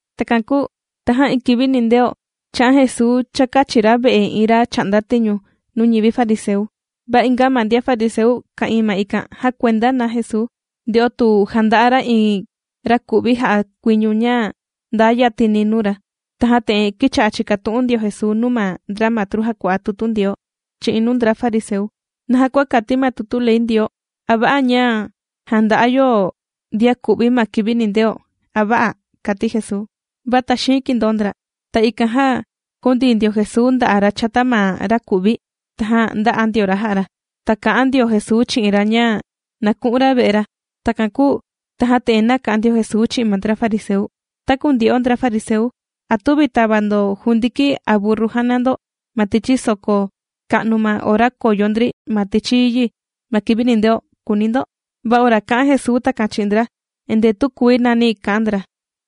Takan kūu tajan iin kivi nindeo, chā'an Jesuu chākachi ra ve'e iin ra chà'nda tiñu nuu ñivi fariseu. Va inga ma ndian fariseu ka'ìin ma ikan jàkuenda na Jesuu, nde'o tu janda'a ra iin raku'vi jà'a kuiñu ña ndaa yatini nuu ra. Tajan te'en kīcha'a chìkatu'un ndio Jesuu nuu ma ndra matru jàkua'a tutu Ndioo chi'in nuu ndra fariseu: ―¿Naja kua kati ma tutu ley Ndioo, a va'a ña jànda'a yo ndian ku'vi ma kivi nindeo, a vä'a? ―kàti Jesuu. Va taxiin kìndoo ndra. Ta ikan jan jūndii ndio Jesuu nda'a' ra chata ma ra kù'vi, tajan ndā'a ndio ra jā'a ra. Ta kà'an ndio Jesuu chi'in ra ña na ku'un ra ve'e ra. Takan kūu tajan te'en nāka'an ndio Jesuu chi'in ma ndra fariseu: ―Taku ndyo'o ndra fariseu, ¿a tüvi tàva ndo jundiki a burru jàna ndo ma tichi soko ka'nu ma ora kòyo ndri ma tichi yi ma kivi nindeo?, kùuni ndo. Va ora kā'an Jesuu takan chi'in ndra, endee tükuii nani kà'an ndra.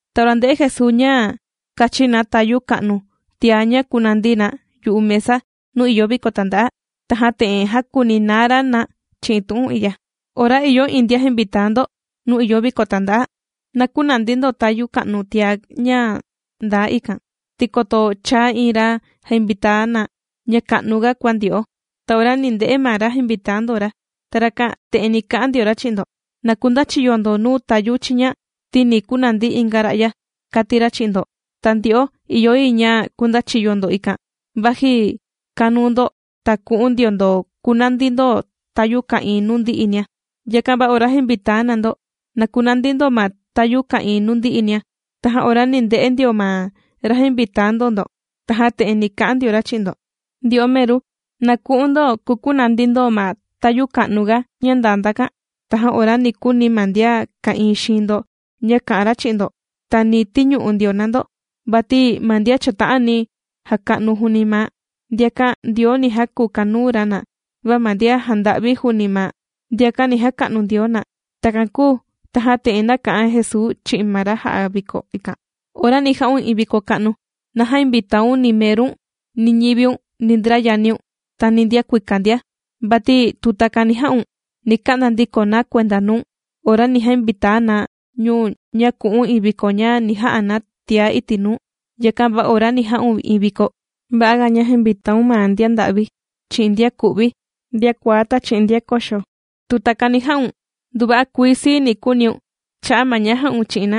Ta ora ndē'e Jesuu ña kàchin na tayu ka'nu tiá ña kùnandi na yu'u mesa nuu ìyo viko tanda'a, tajan te'en jākuninaa ra na chi'in tu'un i'ya: ―Ora ìyo iin ndian jàmvitaa ndo nuu ìyo viko tanda'a, na künandi ndo tayu ka'nu tiá ña ndaa ikan, ti koto chaa iin ra jàmvitaa na ña ka'nuga kua ndyo'o, ta ora ni nde'e ma ra jainvitaa ndo ra, ta rakan te'en ni ka'an ndio ra chi'in ndo: “Na kundachiyo ndo nuu tayu chiña ti ni kunandi inga ra'ya”, kàti ra chi'in ndo. Ta ndyo'o ìyo yi ña kundachiyo ndo ikan, vaji kanuu ndo. Ta ku'un ndio ndo kukunandi ndo tayu ka'ìin nuu ndi'inia. Yakan va ora jàmvitaa na ndo, na kunandi ndo ma tayu ka'ìin nuu ndi'inia, tajan ora ni nde'e ndio ma ra jāinvitaa ndo ndo, tajan te'en ni ka'an ndio ra chi'in ndo: “Ndyo'o meru, na ku'un ndo kukunandi ndo ma tayu ka'nuga ña ndaa ndakan.” Tajan ora ni kuni ma ndian ka'ìin xiin ndo ña kà'an ra chi'in ndo, ta ni tiñu'u ndio na ndo. Vati ma ndian chàta'ani jaka'nu juuni maa', ndiakan Ndioo ni jakukanuu ra na. Va ma ndian jànda'vi juuni maa', ndiakan ni jaka'nu Ndioo na. Takan kūu tajan te'en nāka'an Jesuu chi'in ma ra jā'a viko ikan: ―Ora ni ja'un iin viko ka'nu, na jämvitaun ni merun ni ñiviun ni ndra yaniun, ta ni ndian kuika ndia. Vati tu takani jà'un, ni ka'nda ndiko na kuenda nuu̱n, ora ni jainvitaa na ñu̱n ña ku'un iin viko ña ni ja'a na tiá iti' nuu. Yakan va ora ni ja'un iin viko, va'a ga ña jainvitaaun ma ndian nda'vi chi'in ndian ku'vi ndian kuaá ta chi'in ndian koxo. Tu takani jà'un nduva'a kuii sii ni kuuniun cha'a' ma ña jā'un chi'in na,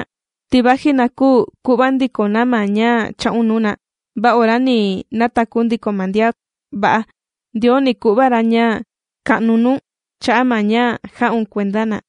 ti vaji na küu ku'va ndiko na ma ña chā'un nuu na, va ora ni nataku ndiko ma ndian va'a, Ndioo ni ku'va ra ña ka'nu nuu̱n cha'a' ma ña jā'un kuenda na.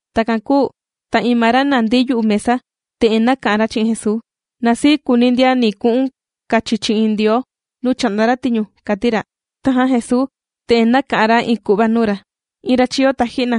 Takan kūu ta iin ma ra nàndi yu'u mesa, te'en nāka'an ra chi'in Jesuu: ―Na sii kuuni ndian ni ku'un kachi chi'in Ndioo nuu chà'nda ra tiñu ―kàti ra. Tajan Jesuu te'en nāka'an ra iin ku'va nuu ra: ―Iin ra chīyo taji'na,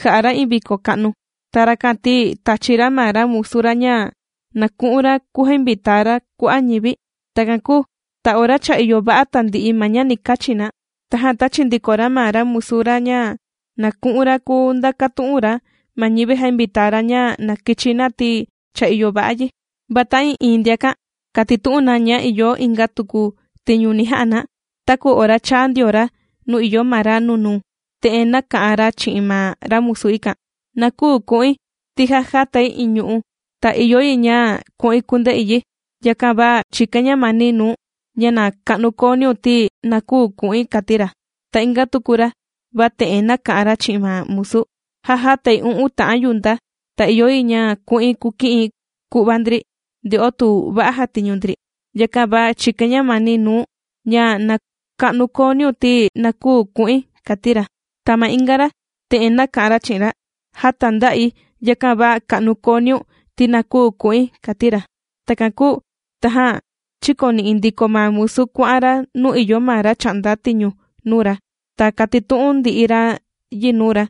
jà'a ra iin viko ka'nu. Ta rakan ti tāchi ra ma ra musu ra ña na ku'un ra kujainvitaa ra kua'a' ñivi. Takan kūu ta ora cha ìyo va'a tandi'i ma ña ni kachi na, tajan tāchi ndiko ra ma ra musu ra ña na ku'un ra kujandakutu'un ra ma ñivi jāinvitaa ra ña na kichi na ti cha ìyo va'a yi. Va ta'ii'iin ndiakan kātitu'un na ña ìyo inga tuku tiñu ni ja'a na. Taku ora chāa ndio ra nuu ìyo ma ra nunuu, te'en nāka'an ra chi'in ma ra musu ikan: “Na küu ku'in ti já jātai iin ñu'u', ta ìyo yi ña ku'in kunde'i yi. Yakan va chìkain ñamani nuu̱n ña na ka'nu kooniun ti na küu ku'in”, kàti ra. Ta inga tuku ra va te'en nāka'an ra chi'in ma musu: “Já jātai u'un ta'an yunta, ta ìyo yi ña ku'in kuki'in ku'va ndri nde'o tu va'a jàtiñu ndri. Yakan va chìkain ñamani nuu̱n ña na ka'nu kooniun ti na küu ku'in”, kàti ra. Ta ma inga ra te'en nāka'an ra chi'in ra: “Já tānda'i, yakan va ka'nu kooniun ti na küu ku'in”, kàti ra. Takan kūu tajan chīkoni'i ndiko ma musu kuà'an ra nuu ìyo ma ra chà'nda tiñu nuu ra. Ta kātitu'un ndi'i ra yi nuu ra.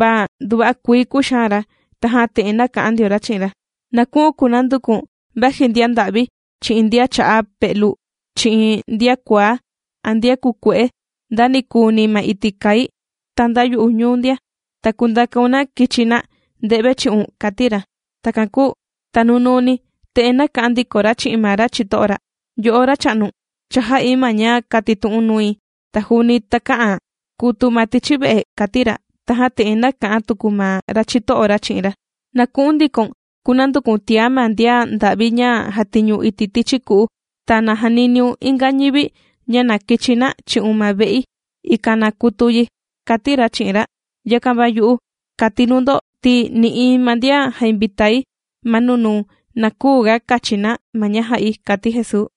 Va nduva'a kuii kūxaan ra, tajan te'en nāka'an ndio ra chi'in ra: “Na ku'u̱n kunanduku̱n vaji ndian nda'vi chi'in ndian cha'a pe'lu chi'in ndian kuaá a ndian kukue'e nda ni kuuni ma iti' kai, ta nda yu'u ñuu ndia. Ta kundakaun na kichi na nde've chi'un”, kàti ra. Takan kūu ta nunuuni te'en nāka'an ndiko ra chi'in ma ra chito'o ra: “Yo'o racha'nu, cha jā'i ma ña kātitu'u̱n nui, ta juuni takä'an kutu ma tichi ve'e”, kàti ra. Tajan te'en nāka'an tuku ma ra chito'o ra chi'in ra: “Na ku'un ndikoun kunanduku̱n tiá ma ndian nda'vi ña jàtiñu iti' tichi ku'u ta na janiniun inga ñivi ña na kichi na chi'un ma ve'i, ikan na kutu yi”, kàti ra chi'in ra. Yakan va yu'u, kàti nuu ndo ti nï'iin ma ndian jāinvitai ma nunuu na küu ga kachi na ma ña jā'i ―kàti Jesuu.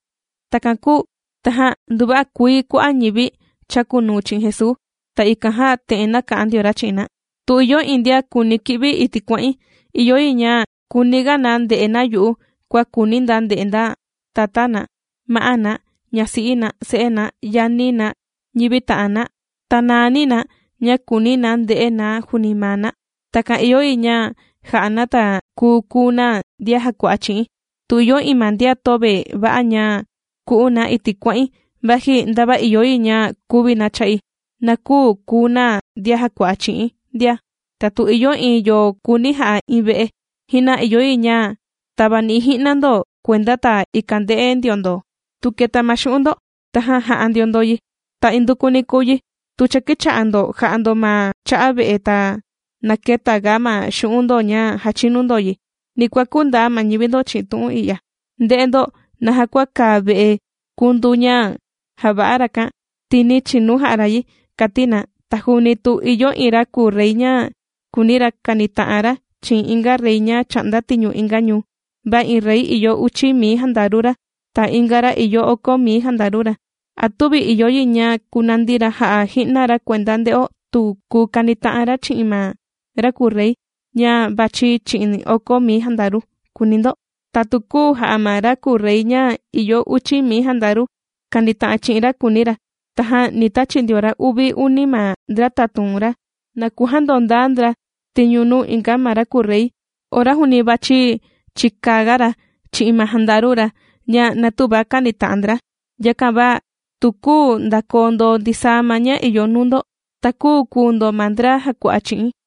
Takan kūu tajan nduva'a kuii kua'a' ñivi chàkunuu chi'in Jesuu. Ta ikan jan te'en nāka'an ndio ra chi'in na: ―Tu ìyo iin ndian kùuni ki'vi iti' kuà'in, ìyo yi ña kuuniga na nde'e na yu'u kua kùuni na nde'e na tatá na, ma'á na, ñasi'i na, se'e na, yani na ñivi ta'an na, ta naani na ña kùuni na nde'e na juuni maa na. Takan ìyo yi ña ja'a na ta kùu kuu na ndian jàkua'a chi'i̱n. Tu ìyo iin ma ndian töve va'a ña ku'un na iti' kuà'in vaji ndava ìyo yi ña kuvi na cha'i, na küu kuu na ndian jàkua'a chi'i̱n ndia. Ta tu ìyo iin yo kùuni ja'a iin ve'e, ji'na ìyo yi ña tavani'i ji'na ndo kuenda ta ikan nde'e ndio ndo tu keta ma xu'un' ndo, tajan ja'a ndio ndo yi. Ta indukuni kùu yi tu cha kīcha'a ndo jà'a ndo ma cha'a ve'e, ta na këtaga ma xu'un' ndo ña jàchinu ndo yi, ni kuakú ndaa ma ñivi ndo chi'in tu'un i'ya: “Nde'e ndo naja kua kàa ve'e kundu ña jàva'a rakan, ti nī chinu jà'a ra yi”, kàti na. Ta juuni tu ìyo iin ra kùu rey ña kùuni ra kanita'an ra chi'in inga rey ña chà'nda tiñu inga ñuu, va iin rey ìyo uchi mii jandaru ra ta inga ra ìyo oko mii jandaru ra, ¿a tüvi ìyo yi ña kunandi ra ja'a ji'na ra kuenda, nde'o tu kùu kanita'an ra chi'in ma ra kùu rey ña vachi chi'in oko mii jandaru?, kùuni ndo. Ta tu küu ja'a ma ra kùu rey ña ìyo uchi mii jandaru kanita'an ra chi'in ra, kuuni ra, tajan ni tachi ndio ra uvi uni ma ndra tatun ra na kujandondaa ndra tiñu nuu inga ma ra kùu rey ora juuni vàchi chikaga ra chi'in ma jandaru ra ña na tüva kanita'an ndra. Yakan va tu küu ndakoo ndo ndisaa ma ña ìyo nuu ndo, ta küu kuu ndo ma ndra jàkua'a chi'i̱n.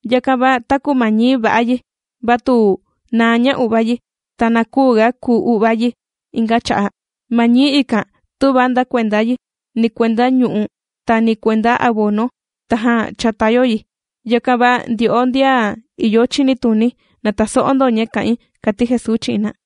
’Yakan va taku ma ñií va'a yi, va tu naa ña u'vá yi, ta na küuga kuu u'vá yi inga cha'a'. Ma ñií ikan tüva nda kuenda yi ni kuenda ñu'u' ta ni kuenda abono tajan chàta yo yi. Yakan va ndyo'o ndian ìyo chinituni, na taso'o ndo ña kà'in ―kàti Jesuu chi'in na.